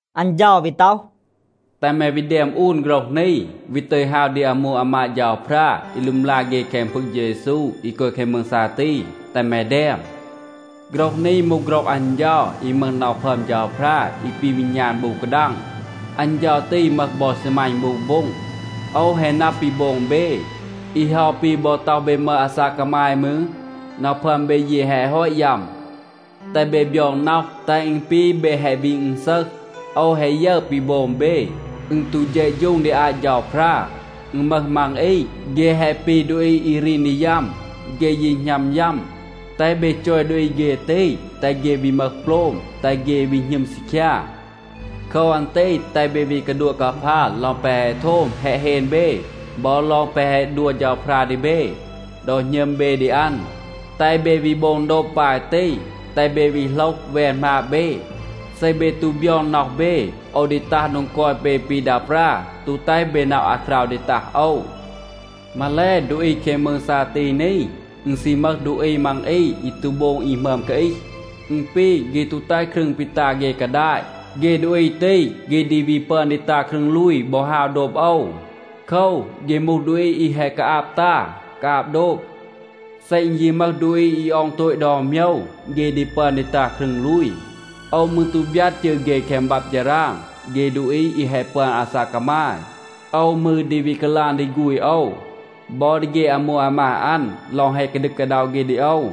อัน เฌา วี ต็อห, “แตห แม วี แดม อูน โฆรห นี, วี ตึย ฮาว ดี อามู อามาด เฌาพรา อี ลึมลา เฆ แคง พึง เฌา เยซู อี กอย แคง มืง ซาตี. แตห แม แดม, ‘โฆรห นี มูห โฆรห อัน เฌา อี มึห น็อห พึอม เฌาพรา อี ปี วีณาน บู กาดัง. อัน เฌา ตี มึห บอ ซีมัณ บู โบ็ง. โอว แฮะ นับ ปี โบง เบ. อี เฮา ปี บอ ต็อห เบ มึห อาซาก กามาย มืร, น็อห พึอม เบ ยี แฮะ ฮอต ยัม. แตห เบ บยอง น็อห, แตห อึณ ปี เบ แฮะ วี อึณซึห. โอว แฮะ ยึร ปี โบง เบ, อึณ ตู เฌะฌูง ดี อาต เฌาพรา. อึณ มึห มัง อี, เฆ แฮะ ปี ดูอี อี รีน ดี ยัม, เฆ ยี หณัม ยัม. แตห เบ จอย ดูอี เฆ ตี, แตห เฆ วี มึห โปลม, แตห เฆ วี หณึม ซีคยา. โคว อัน ตี แตห เบ วี กาดัวะ กาพา ลอง แปะ แฮะ โทม แฮะ เฮน เบ บอ ลอง แปะ แฮะ ดัว เฌาพรา ดี เบ ดอ หณึม เบ ดี อัน. แตห เบ วี โบง โดบ ปาย ตี. แตห เบ วี โหลห แวน หมาบ เบ. เซ เบ ตู บยอง น็อห เบ, โอว ดี ตัห โดง กอย เบ ปี ดา ปรา, ตู แตห เบ นับ อาคราว ดี ตัห โอว. มาแล, ดูอี แคง มืง ซาตี นี, อึณ ซี มึห ดูอี มัง อี อี ตู โบง อี หมึอม กาอีห. อึณ ปี, เฆ ตู แตห ครึง ปี ตา เฆ กาดาต. เฆ ดูอี ตี, เฆ ดี วี ปึอน ดี ตา ครึง ลูย บอ ฮาว โดบ โอว. โคว, เฆ มูห ดูอี อี แฮะ กาอาบ ตา, กาอาบ โดบ. เซ อึณ ยี มึห ดูอี อี ออง โตต ดอน โมยว, เฆ ดี ปึอน ดี ตา ครึง ลูย. โอว มืร ตู บยัด จืร เฆ แคง บับ ฌาราง เฆ ดูอี อี แฮะ ปึอน อาซาก กามาย. โอว มืร ดี วี กาลาง ดี ฆูณ โอว, บอ ดี เฆ อามู อามาด อัน ลอง แฮะ กาดึก กาด็อะ เฆ ดี โอว.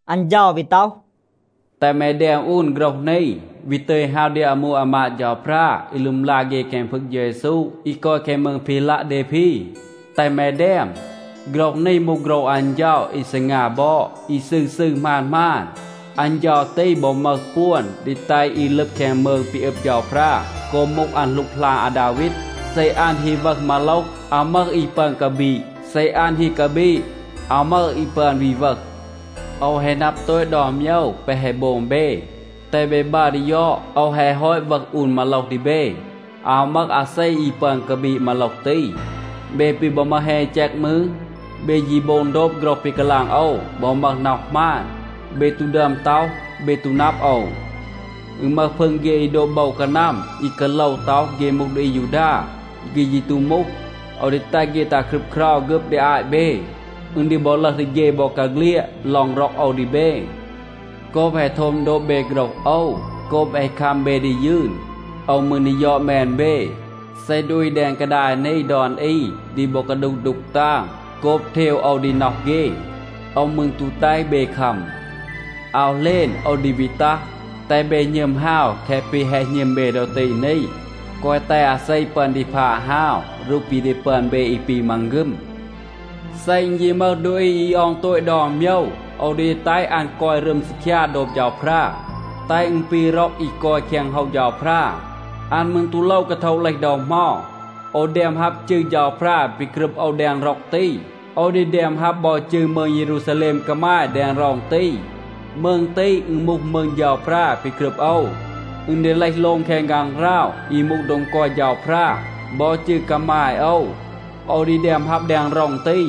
อัน เฌา วี ต็อห, “แตห แม แดม อูน โฆรห นี, วี ตึย ฮาว ดี อามู อามาด เฌาพรา อี ลึมลา เฆ แคง พึง เฌา เยซู อี กอย แคง มืง พีลัะเดพี. แตห แม แดม, ‘โฆรห นี มูห โฆรห อัน เฌา อี ซีงา บอด, อี ซืร ซืร, หมาน หมาน. อัน เฌา ตี บอ มึห ปวน ดี แตห อี ลึบ แคง มืง ปี อึบ เฌาพรา โกบ มูห อัน หลูกหลาน อาดาวีด. เซ อัน ฮี วึห มาโลห, อาว มึห อี ปึอน กาบีด. เซ อัน ฮี กาบีด, อาว มึห อี ปึอน วี วึห. โอว แฮะ นับ โตต ดอน โมยว แปะ แฮะ โบง เบ. แตห เบ บัร ดี ยอด. โอว แฮะ ฮอต วึห อูน มาโลห ดี เบ. อาว มึห อาเซ อี ปึอน กาบีด มาโลห ตี. เบ ปี บอ มึห แฮณ อี แจก มืร, เบ ยี โบง โดบ โฆรห ปี กาลาง โอว บอ มึห น็อห หมาน. เบ ตู ดึอม ต็อห, เบ ตู นับ โอว. อึณ มึห พึง เฆ อี โดบ โบว กานัม อี กาโลว ต็อห เฆ มูห ดูอี อายูดา, เฆ ยี ตู มูห. โอว ดี แตห เฆ ตัห ครึบเครา ฆึบ ดี อาต เบ. อึณ ดี บอ ลึห ดี เฆ บอกาเฆลียด ลอง ร็อก โอว ดี เบ. โกบ แฮะ โทม โดบ เบ โฆรห โอว, โกบ แฮะ คัม เบ ดี ยืน, โอว มืร ดี ยอด แมน เบ. เซ ดูอี แดง กาดาย นี ดอน อี ดี บอ กาดูห ดูก ตาง, โกบ เทว โอว ดี น็อห เฆ, โอว มืร ตู แตห เบ คัม. อาว เหลณ โอว ดี วี ตัห. แตห เบ หณึม ฮาว แคะ ปี แฮะ หณึม เบ ดอ ตี นี. แกวะ แตห อาเซ ปึอน ดี พาด ฮาว รูห ปี ดี ปึอน เบ อี ปี มังฆึม. เซ อึณ ยี มึห ดูอี อี ออง โตต ดอน โมยว, โอว ดี แตห อัน กอย รึม ซีคยา โดบ เฌาพรา, แตห อึณ ปี ร็อง อี กอย แคง โฮว เฌาพรา. อัน มืร ตู โลว กาโทะ เลห ดอ เหมา. โอว แดม ฮับ จืร เฌาพรา ปี กรึบ โอว แดง ร็อง ตี. โอว ดี แดม ฮับ บอ จืร มืง เยรูซาแลม กามาย แดง ร็อง ตี. มืง ตี, อึณ มูห มืง เฌาพรา ปี กรึบ โอว. อึณ ดี เลห โลง แคง ฆางหราว อี มูห โดง กอย เฌาพรา. บอ จืร กามาย โอว, โอว ดี แดม ฮับ แดง ร็อง ตี.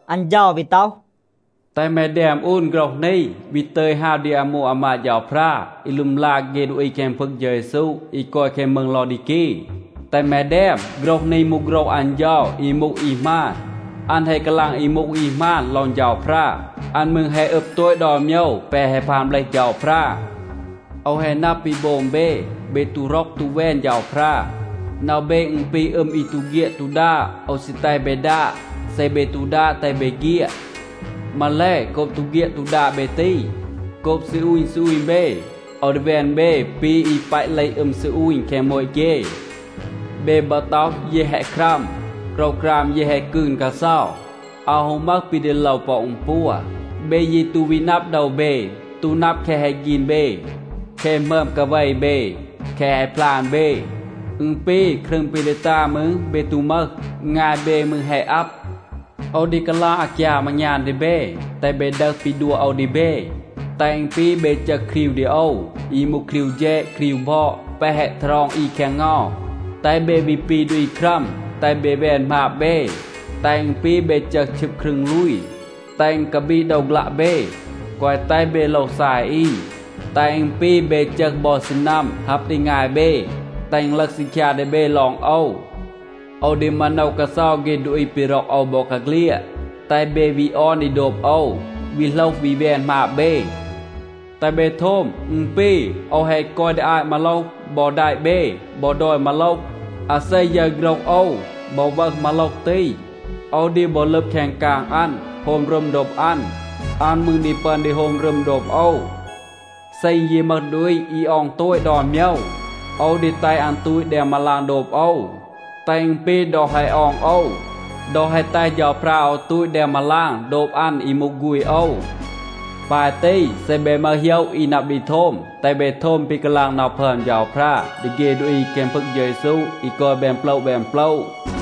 อัน เฌา วี ต็อห, “แตห แม แดม อูน โฆรห นี, วี ตึย ฮาว ดี อามู อามาด เฌาพรา อี ลึมลา เฆ ดูอี แคง พึง เฌา เยซู อี กอย แคง มืง ลอดีกี. แตห แม แดม, ‘โฆรห นี มูห โฆรห อัน เฌา อี มูห อี หมาน. อัน แฮะ กาลาง อี มูห อี หมาน ลอง เฌาพรา. อัน มืร แฮะ อึบ โตต ดอน โมยว แปะ แฮะ พาน เบลห เฌาพรา. โอว แฮะ นับ ปี โบง เบ. เบ ตู ร็อก ตู แวน เฌาพรา. น็อห เบ อึณ ปี อึม อี ตู เฆียด ตู ดาด. โอว ซี แตห เบ ดาด. เซ เบ ตู ดาด, แตห เบ เฆียด. มาแล, โกบ ตู เฆียด ตู ดาด เบ ตี, โกบ ซีอูณ ซีอูณ เบ, โอว ดี แวน เบ ปี อี ปัต เลห อึม ซีอูณ แคง โมต เฆ. เบ บอ ต็อห, “เย แฮะ ครัม, โกรวกราม เย แฮะ กืน กาเซา, อาว ฮู มึห ปี ดี โลว ปอ อึณปัว.” เบ ยี ตู วี นับ โดว เบ, ตู นับ แคะ แฮะ ฆีน เบ, แคะ หมึอม กาเว เบ, แคะ แฮะ พลาน เบ. อึณ ปี, ครึง ปี ดี ตา มืร, เบ ตู มึห. งาย เบ มืร แฮะ อับ. โอว ดี กาลาง อากยาม อางยาน ดี เบ, แตห เบ ดึห ปี ดัว โอว ดี เบ, แตห อึณ ปี เบ จึห ครีว ดี โอว, อี มูห ครีว แฌด, ครีว บอด แปะ แฮะ ทารอง อี แคง เงา. แตห เบ วี ปี ดูอี ครัม. แตห เบ แวน หมาบ เบ, แตห อึณ ปี เบ จึห ชึบ ครึง ลูย, แตห อึณ กาบีด โดว ฆลัะ เบ, แกวะ แตห เบ โลว ซาย อี. แตห อึณ ปี เบ จึห บอ ซีนัม ฮับ ดี งาย เบ, แตห อึณ ลึห ซีคยา ดี เบ ลอง โอว. โอว ดี มาโนว กาเซา เฆ ดูอี ปี ร็อก โอว บอกาเฆลียด. แตห เบ วี ออน ดี โดบ โอว, วี โหลห วี แวน หมาบ เบ. แตห เบ โทม. อึณ ปี, โอว แฮะ กอย ดี อาต มาโลห บอ แดะ เบ บอ ดอย มาโลห. อาเซ ยึร โฆรห โอว บอ วึห มาโลห ตี, โอว ดี บอ ลึบ แคง กาง อัน, โฮม รึม โดบ อัน. อัน มืร ดี ปึอน ดี โฮม รึม โดบ โอว. เซ อึณ ยี มึห ดูอี อี ออง โตต ดอน โมยว, โอว ดี แตห อัน ตูต แดง มาลาง โดบ โอว, แตห อึณ ปี ดอ แฮะ ออง โอว, ดอ แฮะ แตห เฌาพรา โอว ตูต แดง มาลาง โดบ อัน อี มูห ฆูณ โอว. ปาย ตี, เซ เบ มึห โหยะ อี นับ ดี โทม, แตห เบ โทม ปี กาลาง น็อห พึอม เฌาพรา ดี เฆ ดูอี แคง พึง เฌา เยซู อี กอย แบน โปละ แบน โปละ.’”